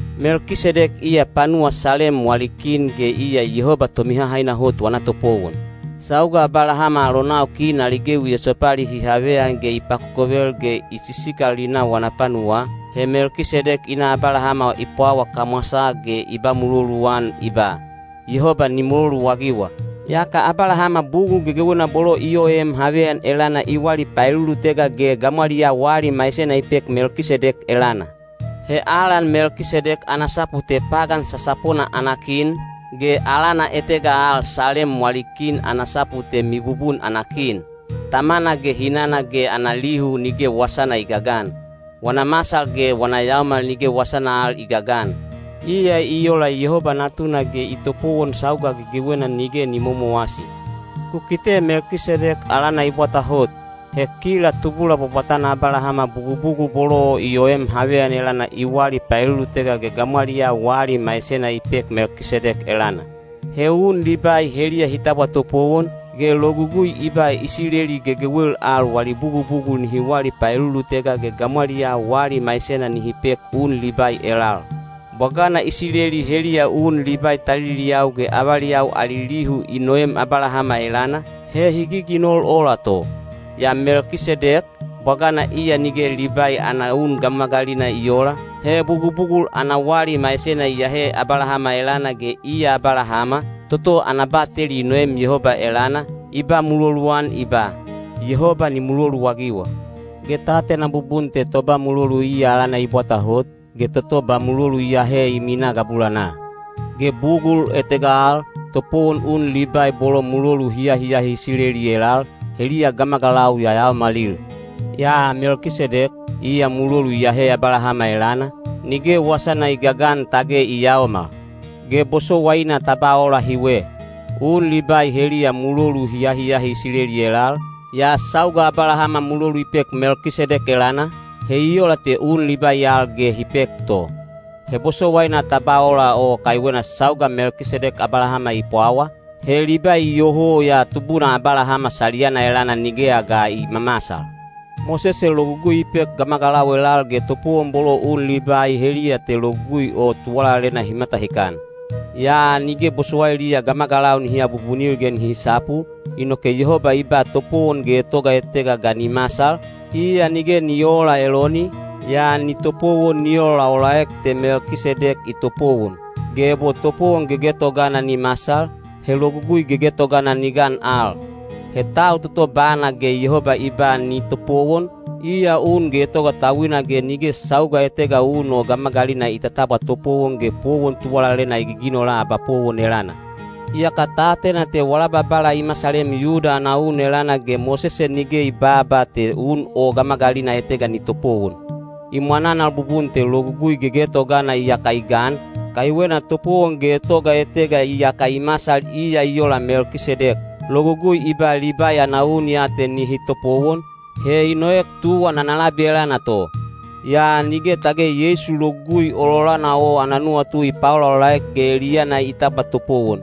Melkisedek iya panuwa Salem wali kin ge iya Yehoba Tomihahaina Hot wana topowon. Sauga Abalahama alonau kin ali gewi esopali hi haveyan ge i pakokovel ge i sisikal wana panuwaa, he Melkisedek i na Abalahama i pwawa kamwasaa ge i ba muloluan i ba, “Yehoba ni muloluagiwa.” Yaka Abalahama bugul gegewena bolo i oem haveyan elana i wali paelulutega ge gamwaliyaa wali maisena i pek Melkisedek elana. He alan Melkisedek ana sapu te “Pagan Sasapona ana Kin,” ge alana etega al “Salem wali Kin” ana sapu te “Mibubun ana Kin.” Tamana ge hinana ge ana lihu nige wasana i gagan. Wana masal ge wana yaomal nige wasana al i gagan. Iya i ola Yehoba Natuna ge i topowon sauga gegewena nige ni momowasi. Ku kite Melkisedek alana i bwata hot. He kila tubula bwabwatana Abalahama bugubugul bolo i oem haveyan elana i wali paelulutega ge gamwaliyaa wali maisena i pek Melkisedek elana. He un Libai heliya hi tabwa topowon, ge Logugui i ba Isileli gegewel al wali bugubugul nihi wali paelulutega ge gamwaliyaa wali maisena nihi pek un Libai elal. Bwagana Isileli heliya un Libai taliliyau ge avaliyau ali lihu i noem Abalahama elana, he hi giginol ola to. Yaa Melkisedek, bwagana iya nige Libai ana un gamagalina i oola, he bugubugul ana wali maisena i ahe Abalahama elana ge iya Abalahama, toto ana bateli i noem Yehoba elana, i ba muloluan i ba, “Yehoba ni muloluagiwa.” Ge ta atena bubun te toba mulolu iya alana i bwata hot, ge toto ba mulolu i ahe i minaa gabulanaa. Ge bugul etega al, topowon un Libai bolo mulolu hi ahiahi Isileli elal, heliya gamagalau yayaomalil. Yaa Melkisedek, iya mulolu i ahe Abalahama elana, nige wasana i gagan tage i yaomal. Ge bosowaina ta ba ola hiwe. Un Libai heliya mulolu hi ahiahi Isileli elal, yaa sauga Abalahama mulolu i pek Melkisedek elana, he i ola te un Libai al ge hi pek to. He bosowaina ta ba ola o kaiwena sauga Melkisedek Abalahama i pwawa, he Libai iyoho ya tubuna Abalahama saliyana elana nigeya ga i mamasal. Mosese Logugui i pek gamagalau elal ge topowon bolo un Libai heliya te Logugui o tuwalalena hi matahikan. Yaa nige bosowailiya gamagalau nihi abubunil ge nihi sapu, inoke Yehoba i ba topowon getoga etega ga ni masal, iya nige ni oola Eloni, yaa ni topowon ni olaolaek te Melkisedek i topowon. Ge ebo topowon gegetogana ni masal, he logugui gegetogana ni gan al. He tau toto bana ge Yehoba i ba ni topowon, iya un getoga tauina ge nige sauga etega un o gamagalina i tatabwa topowon ge powon tuwalalena i giginola abapowon elana. Iyaka ta atena te wala Babala i masalem Yuda ana un elana ge Mosese nige i babaa te un o gamagalina etega ni topowon. I mwananal bubun te logugui gegetogana iyaka i gan, kaiwena topowon getoga etega iyaka i masal iya i ola Melkisedek. Logugui i ba Libai ana un ya te nihi topowon, he i noek tuwan ana labi elana to. Yaa nige tage Yeisu logugui ololana o ana nuwatu i paolaolaek ge eliyana i tabwa topowon.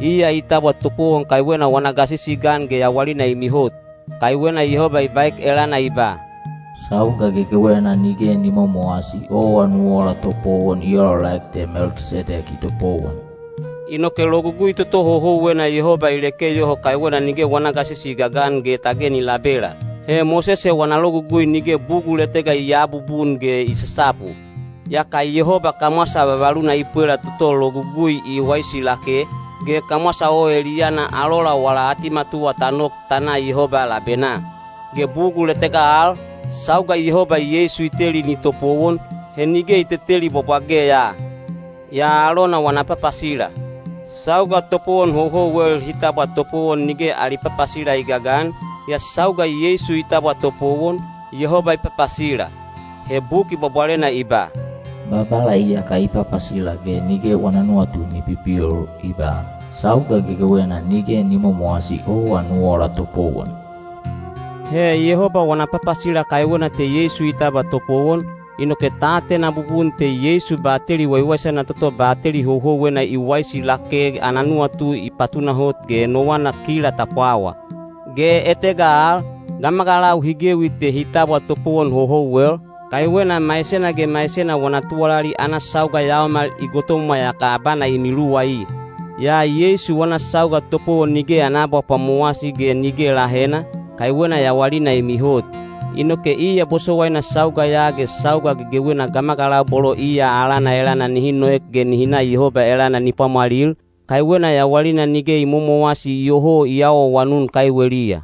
Iya i tabwa topowon kaiwena wana gasisi i gan ge yawalina i mihot. Kaiwena Yehoba i baek elana i ba, “Sauga gegewena nige ni momowasi owa nu ola topowon i olaolaek te Melkisedek i topowon.” Inoke logugui toto houhouwena Yehoba i leke yoho kaiwena nige wana gasisi i gagan ge tage ni labela. (He Mosese wana Logugui nige bugul etega i aabubun ge i sasapu.) Yaka Yehoba kamwasa vavaluna i pwela toto Logugui i waisi lake, ge kamwasa o eliyana alola wala atimatuwa ta nok ta na Yehoba labenaa. Ge bugul etega al, sauga Yehoba Yeisu i teli ni topowon, he nige i teteli bwabwage ya, yaa alona wana papasila. Sauga topowon houhouwel hi tabwa topowon nige ali papasila i gagan, yaa sauga Yeisu i tabwa topowon, Yehoba i papasila. He Buki Bwabwalena i ba: Babala iyaka i papasila ge nige wana nuwatu ni pipil, i ba, “Sauga gegewena nige ni momowasi owa nu ola topowon.” He Yehoba wana papasila kaiwena te Yeisu i tabwa topowon, inoke ta atena bubun te Yeisu bateli waiwaisana toto bateli houhouwena i waisi lake ana nuwatu i patunahot ge enowana kila ta pwawa. Ge etega al, gamagalau hi gewi te hi tabwa topowon houhouwel, kaiwena maisena ge maisena wana tuwalali ana sauga yaomal i gotomwa yaka abana i miluwai. Yaa Yeisu wana sauga topowon nige ana abapwamowasi ge nige lahena, kaiwena yawalina i mihot. Inoke iya bosowaina sauga ya ge sauga gegewena gamagalau bolo iya alana elana nihi noek ge nihi na Yehoba elana ni pwamwalil, kaiwena yawalina nige i momowasi iyoho i awaawanun kaiweliya.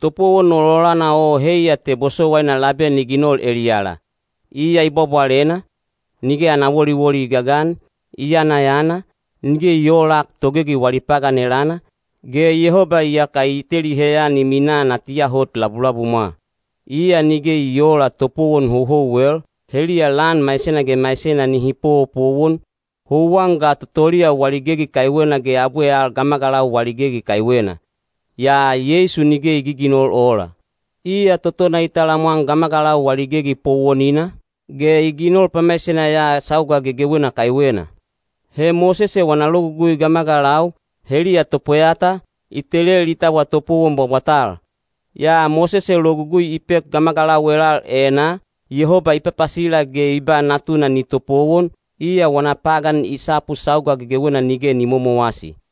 Topowon ololana o heiya te bosowaina labe ni ginol eliyala. Iya i bwabwalena, nige ana woliwoli i gagan, i yanayana, nige i oolak togegi wali pagan elana, ge Yehoba iyaka i teli heyan i minaa natiya hot labulabumwa. Iya nige i oola topowon houhouwel, heliya lan maisena ge maisena nihi powopowon, houwan ga totoliya wali gegi kaiwena ge abwe al gamagalau wali gegi kaiwena. Yaa Yeisu nige i giginol ola. Iya totona i talamwan gamagalau wali gegi powonina, ge i ginol pamaisena ya sauga gegewena kaiwena. He Mosese wana Logugui gamagalau, heliya topweyata, i telel hi tabwa topowon bwabwatal. Yaa Mosese Logugui i pek gamagalau elal enaa, Yehoba i papasila ge i ba Natuna ni topowon, iya wana pagan i sapu sauga gegewena nige ni momowasi.